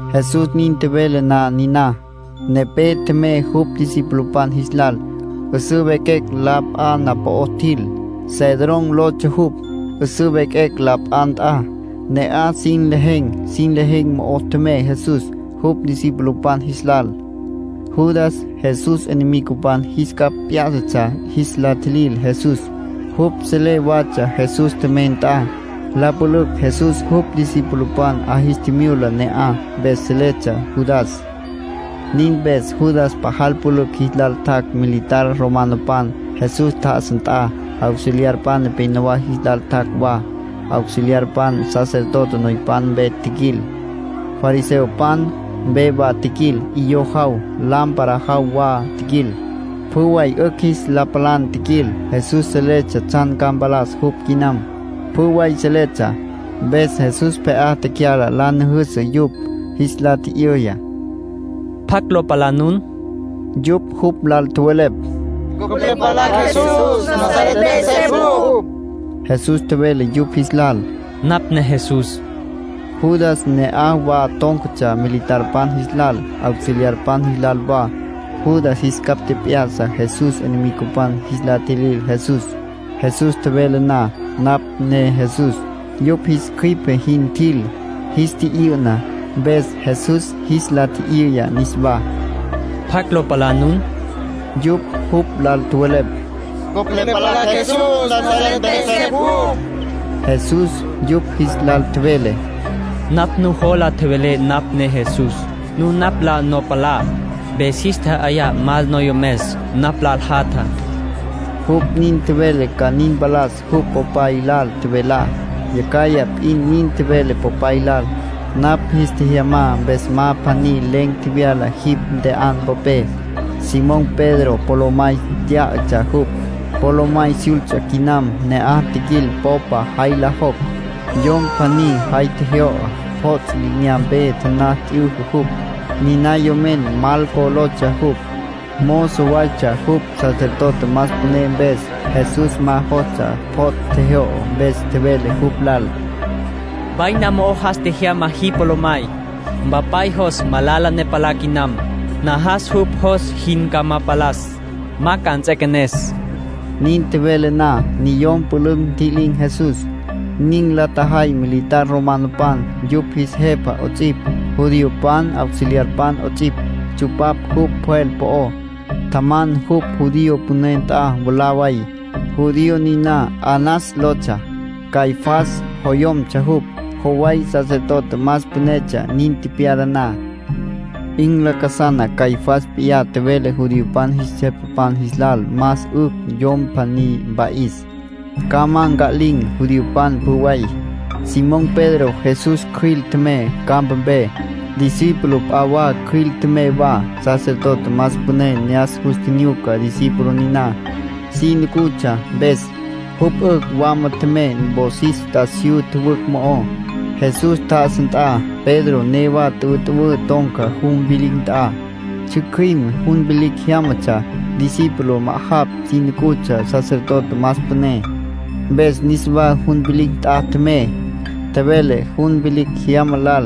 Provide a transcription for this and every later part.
Jesús nin tjevele na niná, nepé tjemey jupj discipulopan jis lal. 'Üsǘ vequecj la pja na'aj po'ó tjil. Cedrón lotsja jupj, 'üsǘ vequecj la pja nt'a. Ne'aj sin lejen̈. Sin lejen̈ mo'o tjemey Jesús, jupj discipulopan jis lal. Judas Jesús enemigopan jis capj p'yá'satsja jis la tjilil Jesús. Jupj selé watsja Jesús tjemey nt'a. La pülücj Jesús jupj discipulopan 'a jis tjimyula ne'aj, mpes seletsja Judas. Nin mpes Judas pajal pülücj jis lal tjac' militar romanopan, Jesús tjá'asa nt'a. Auxiliarpan nepénowa jis lal tjac' wa. Auxiliarpan sacerdote noypan mpe tjiquil, fariseopan mpe wa tjiquil. 'Iyó jaw, lámpara jaw wa tjiquil. Pjü way 'ücj jis la palan tjiquil. Jesús seletsja tsjan ca mpalas jupj quinam, pjü way seletsja. Mpes Jesús pje'á tecyala la nüjüsü yupj. Jis la tji'yüya: —¿Pjacj lo palá nun? Yupj jupj lal tjowelepj: —Cupj le palacj Jesús, Nazaret mpe 'esepj jupj. Jesús tjevele yupj jis lal: —Napj ne Jesús. Judas ne'aj wa tón̈catsja militarpan jis lal, auxiliarpan jis lal wa. Judas jis capj tjep'ya'sa Jesús enemigopan jis la tjilil Jesús. Jesús tjevele na: “Napj ne Jesús”, yupj jis cjüipe jin tjil, jis tyü'na. Mpes Jesús jis la tji'yüya niswá: —¿Pjacj lo palá nun? Yupj jupj lal tjowelepj: —Cupj le palacj Jesús, Nazaret mpe 'esepj jupj. Jesús yupj jis lal tjevele: —Napj nuwola tjevelé napj ne Jesús. Nun napj la no palá, mpes jis tja'ayá mal noyomes napj lal jatjá. Jupj nin tjevele ca nin mpalas jupj Popay lal tjevelá. Yacjaj p'in nin tjevele Popay lal: “Napj jis tjejyamá mpes ma pjaní len̈ tjevyala jipj ntje'an popé”. Simón Pedro polomay tyá'atsja jupj. Polomay syults'a quinam ne'aj tjiquil popa jay lo jocj. Yom pjaní jay tjejyo'o, pjots' li'inyampe taná t'yüjü jupj. Niná yomen Malco lotsja jupj. Mozo waytsja jupj sacerdote más püné mpes. Jesús ma jostsja pjots' tjejyo'o. Mpes tjevele jupj lal: —Vaina mo'o jas tjejyama jipj polomay. Mpapay jos malala ne palá quinam. Najas jupj jos jin ca ma palas. Ma ca nts'equenes. Nin tjevele na, niyom pülücj ntji'lin̈ Jesús. Nin la tjajay militar romanopan, yupj jis jepa 'ots'ipj, judiopan auxiliarpan 'ots'ipj. Tsupapj jupj pjwel po'ó. Tjaman jupj judío püné nt'a mwalá way. Judío niná Anás lotsja. Caifás joyomtsja jupj. Joway sacerdote más pünetsja nin tepyala na. 'In lacasana Caifás p'iyá tjevele judiopan jis jepapan jis lal más 'ücj yom pjaní mpa'is, ca ma nca'lin̈ judiopan pjü way. Simón Pedro Jesús cjüil tjemey campapé. Discípulo p'a wa cjüil tjemey wa. Sacerdote más püné ne'as jus tjinyuca discípulo niná. Si nucutsja mpes, jupj 'ücj wama tjemey wosis t'asiyú tjüwücj mo'ó, Jesús tjá'asa nt'a. Pedro newa tüwütüwǘ ton̈ca jun vilicj nt'a. Tsjücjüim jun vilicj jyámatsja. Discípulo ma'ajapj si nucutsja sacerdote más püné, mpes niswa jun vilicj nt'a tjemey, tjevele jun vilicj jyama lal.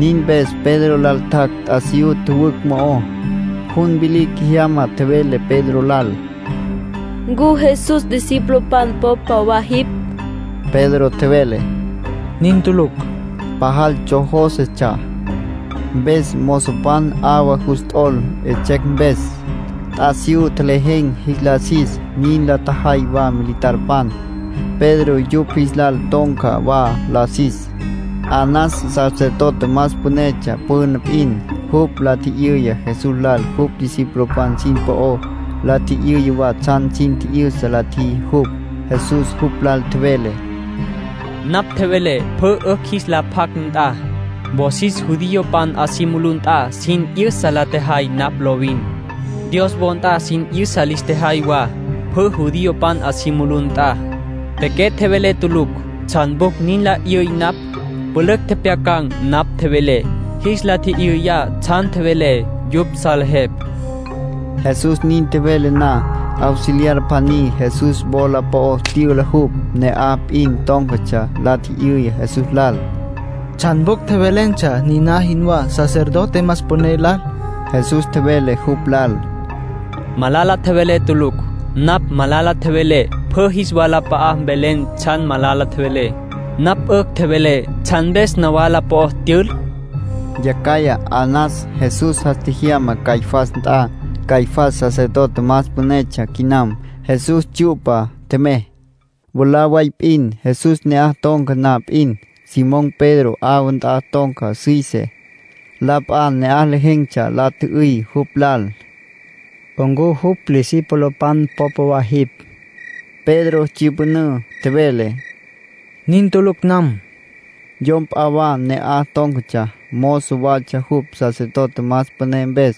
Nin mpes Pedro lal tjac' t'asiyú tjüwücj mo'ó. Jun vilicj jyama tjevele Pedro lal: —¿Ncu Jesús discipulopan popa wa jipj? Pedro tjevele: —Nin tulucj. Pajal tsjojósetsja. Mpes mozopan 'awa jus t'ol 'etsjecj mpes. T'asiyú tjelejen̈ jis la sis. Nin la tjajay wa militarpan. Pedro yupj jis lal ton̈ca wa la sis. Anás sacerdote más pünetsja püna p'in. Jupj la tji'yüya Jesús lal jupj discipulopan sin po'ó. La tji'yüya wa tsjan sin tji'yüsa la tjiji jupj. Jesús jupj lal tjevele: —Napj tjevelé pjü 'ücj jis la pjac nt'a. Wosis judiopan 'a si mulú nt'a sin 'yüsa la tjejay napj lovin. Dios wo nt'a sin 'yüsa lis tjejay wa, pjü judiopan 'a si mulú nt'a. Pequé tjevelé tulucj. ¿Tsjan pjucj nin nla 'yüy napj? Pülücj tjepjyacan̈ napj tjevelé. Jis la tji'yüya tsjan tjevelé. Yupj salejepj. Jesús nin tjevele na, auxiliar pjaní Jesús wola po'ó tyüla jupj. Ne'aj p'in tón̈catsja. La tji'yüya Jesús lal: —¿Tsjan pjucj tjevelentsja nin jinwá, sacerdote más püné lal? Jesús tjevele jupj lal: —Malala tjevelé tulucj. Napj malala tjevelé, pjü jis walap'a'a mvelen tsjan malala tjevelé. Napj 'ücj tjevelé, ¿tsjan mpes nawala po'ó tyül? —tjevele jupj. Yacjaya Anás Jesús jas tjejyama Caifás nt'a. Caifás sacerdote más pünetsja quinam. Jesús tsyu'pa tjemey. Mwalá way p'in, Jesús ne'aj ton̈ca na p'in, Simón Pedro 'awa nt'a ton̈ca süise. La p'a ne'aj lejen̈tsja la tjü'üy jupj lal: —¿Ncu jupj discipulopan popa wa jipj? Pedro tsyüpünǘ. Tjevele: —Nin tulucj nam. Yom p'a wa ne'aj tón̈catsja, mozo watsja jupj sacerdote más püné mpes.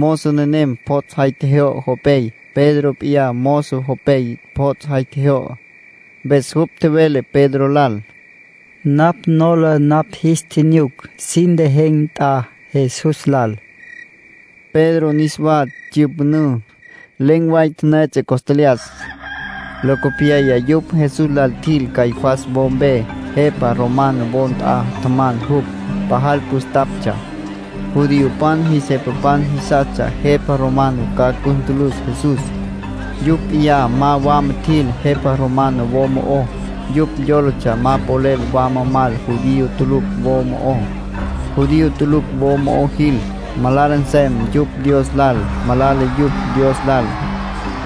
Mozo nenem pjots' jay tjejyo'o jopey. Pedro p'iyá mozo jopey pjots' jay tjejyo'o. Mpes jupj tjevele Pedro lal: —Napj nola napj jis tjinyuc sin lejen̈ nt'a Jesús lal. Pedro niswa tsyüpünǘ. Len̈ way la tipiya costlyas. Locopyaya yupj Jesús lal tjil Caifás wo mpe. Jepa romano wo nt'a tjaman jupj. Pajal püstaptsja. Judiopan jis jepapan jisastsja jepa romano ca cus ntülüs Jesús. Yupj p'iyá ma wama tjil jepa romano wo mo'ó. Yupj yólatsja ma polel wama mal judío tulucj wo mo'ó. Judío tulucj wo mo'ó jil, malala nsem yupj Dios lal. Malala yupj Dios lal,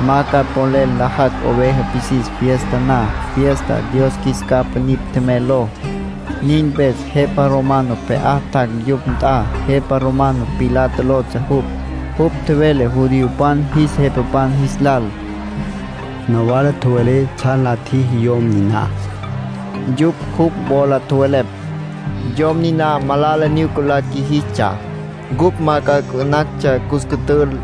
ma ca polel nlajacj oveja pisis fiesta na, fiesta “Dios Qjuis Capa Nipj Tjemey” ló. Nin mpes jepa romano pje'á tjac' yupj nt'a. Jepa romano Pilato lotsja jupj. Jupj tjevele judiopan jis jepapan jis lal: —Nawala tjowelé tsjan la tjiji yom niná. Yupj jupj wola tjowelepj: —Yom niná ma malala nyuca la qjuijistsja, ncupj ma ca 'ucumantsja cus cütül.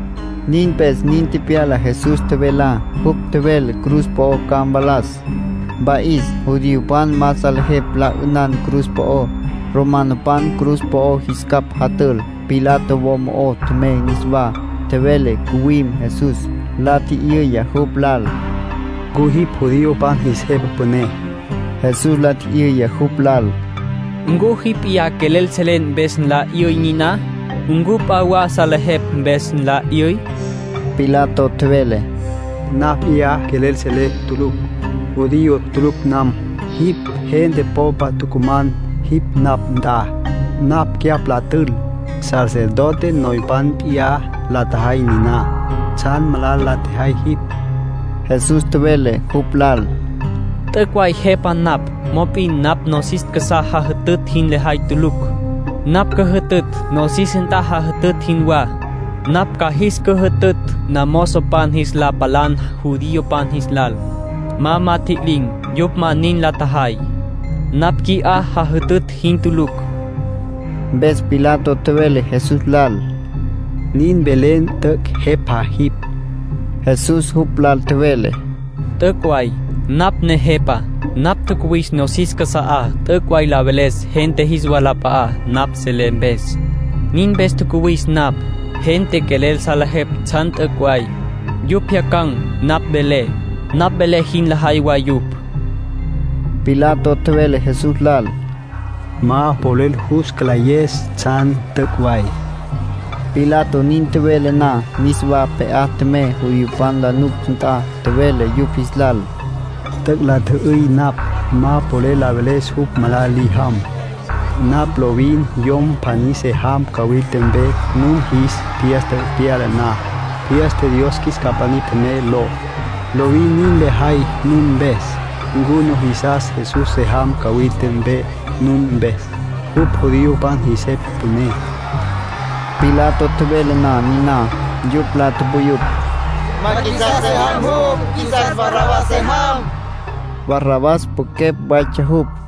Nin mpes nin tepyala Jesús tjevelá. Jupj tjevele cruz po'o ca mvalas, mpa'is. Judiopan ma salejepj la 'ünan cruz po'ó. Romanopan cruz po'o jis capj jatül. Pilato wo mo'ó tjemey niswá, tjevele ncuwim Jesús. La tji'yüya jupj lal: —¿Ncu jipj judiopan jis jepa püné? Jesús la tji'yüya jupj lal: —¿Ncu jipj p'iyá quelel selen mpes nla 'yüy niná? ¿Ncu p'a wa javelepj mpes nla 'yüy? Pilato tjevele: —Napj p'iyá quelel selé tulucj. Judío tulucj nam. Jipj gente popa tucuman jipj napj nt'a, napj cyapj la tül. Sacerdote noypan p'iyá la tjajay niná. ¿Tsjan malala la tjejay jipj? Jesús tjevele jupj lal: —T'üc' way Jepa napj, mop'in napj nosis casá jajütütj jin lejay tulucj. Napj cüjütütj nosis nt'a jajütütj jinwá, napj ca jis cüjütütj namozopan jis la palan judiopan jis lal, ma ma tjililin̈. Yupj ma nin la tjajay. Napj qui'á jajütütj jin tulucj. Mpes Pilato tjevele Jesús lal: —Nin velen t'üc' jepa jipj. Jesús jupj lal tjevele: —T'üc' way. Napj ne jepa. Napj tjacuwis nosis casa'á t'üc' way la veles gente jis walap'a'á, napj selé mpes. Nin mpes tjacuwis napj. Gente quelel salejepj tsjan t'üc' way, yupj pjyacan̈ napj velé. Napj velé jin lajay wa yupj. Pilato tjevele Jesús lal: —Ma polel jus cülayes tsjan t'üc' way. Pilato nin tjevele na, niswa pje'á tjemey judiopan la nuctsja nt'a. Tjevele yupj jis lal: —T'üc' la tji'yüy napj. Ma polel la veles jupj malala li jam. Napj lovin yom pjaní se jam cawilta mpe nun jis fiesta pyala na, fiesta ‘Dios Qjuis Capa Nipj Tjemey’ ló. Lovin nin lejay nun mpes. ¿Ncu nujisas Jesús se jam cawilta mpe nun mpes? Jupj judiopan jis jepa püné. Pilato tjevele na niná, yupj la tupuyupj: —Ma qjuisas se jam jupj. Qjuisas Barrabás se jam. Barrabás pwequepj waytsja jupj.